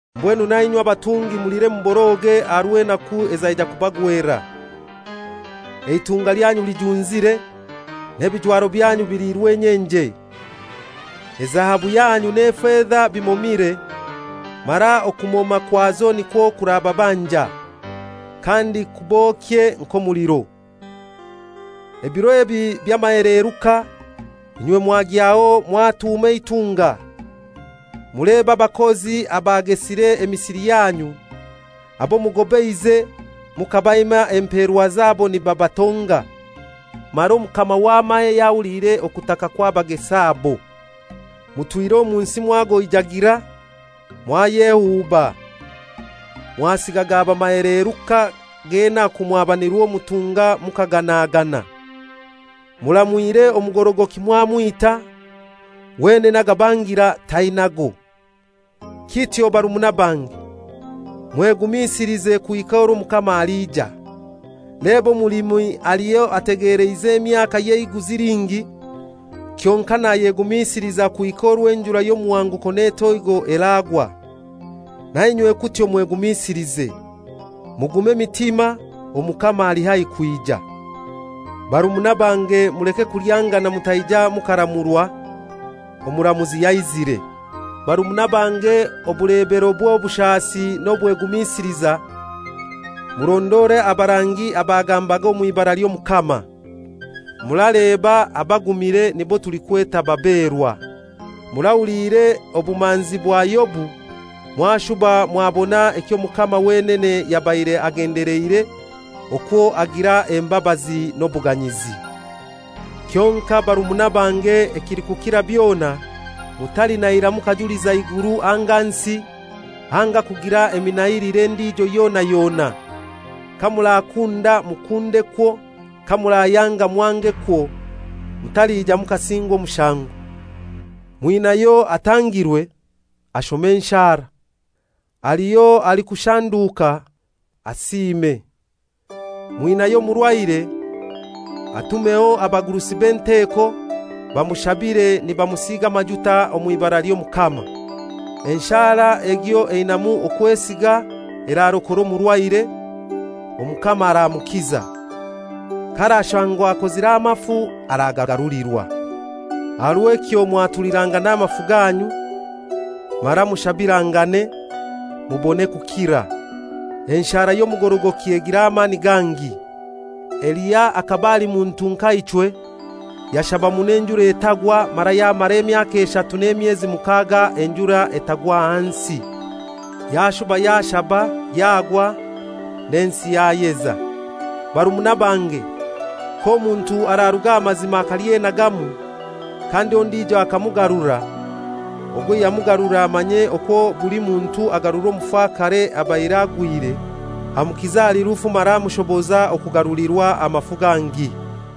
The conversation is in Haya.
Mbwenu nainywe abatungi mulire muboroge aha rw'enaku ezaija kubagwera. Eitunga lyanyu lijunzire, n'ebijwaro byanyu biliirwe enyenje. Ezahabu yanyu n'efeza bimomire, mara okumoma kwazo nikwo kurababanja, kandi kubokye nk'omuliro. Ebiro ebi by'amaheleeruka, inywe mwagyaho mwatuuma eitunga. Mulebe abakozi abagesire emisiri yanyu, abo mugobeize mukabaima empeerwa zabo nibabatonga. Mara Omukama w'amahe yahuliire okutaka kw'abagesi abo. Mutwire omu nsi mwagoijagira, mwayehuuba; mwasiga gaba amaheleruka g'enaku mwaba nirwo mutunga mukaganagana. Muramwire omugorogoki mwamwita; wenene agabangira tainago. Kityo barumuna bange, mwegumisilize kuhika orwo Omukama aliija. Leba omulimi aliho etegeleize emyaka y'eiguzi lingi, kyonkai nayegumisiliza kuhika orwo enjura y'omuhanguko n'etoigo eragwa. Nainywe kutyo mwegumisilize. Mugume emitima, Omukama ali haihi kwija. Barumuna bange muleke kulyangana mutaija mukaramurwa; Omuramuzi yaizire. Barumuna bange, obulebero bw'obushasi n'obwegumisiliza, murondore abarangi abagambaga omw'ibara ly'Omukama. Muraleba, abagumire nibo tulikweta baberwa. Murahuliire obumanzi bwa Yobu, mwashuba mwabona ekyo Omukama wenene yabaire agendeleire, okwo agira embabazi n'obuganyizi. Kyonkai barumuna bange, ekilikukira byona, mutalinahira mukajuliza iguru anga nsi, anga kugira eminahilire endijo yona yona. Kamurakunda mukundekwo, kamurayanga mwangekwo, mutalija mukasingwa omushango. Mwinayo atangirwe? Ashome enshara. Haliho alikushanduka? Asiime. Mwinayo omurwaire? Atumeho abagurusi b'enteko, bamushabire nibamusiiga amajuta omw'ibara ly'Omukama. Enshara egyo einamu okwesiga erarokora omurwaire, Omukama aramukiza. K'arashangwa akozire amafu aragagarulirwa. Aha rw'ekyo mwatulirangane amafu ganyu, mara mushabirangane, mubone kukira. Enshara y'omugorogoki egira amani gangi. Eliya akaba ali muntu nka ichwe, yashaba muno enjura etagwa, mara yamara emyaka eshatu n'emyezi mukaaga enjura etagwa hansi. Yashuba yashaba, yagwa, n'ensi yayeza. Barumuna bange, k'omuntu araruga aha mazima akalyenagamu, kandi ondijo akamugarura, ogwo ayamugarura amanye okwo buli muntu agarura omufakare abaire agwire, amukiza ahali rufu mara amushoboza okugarulirwa amafu gangi.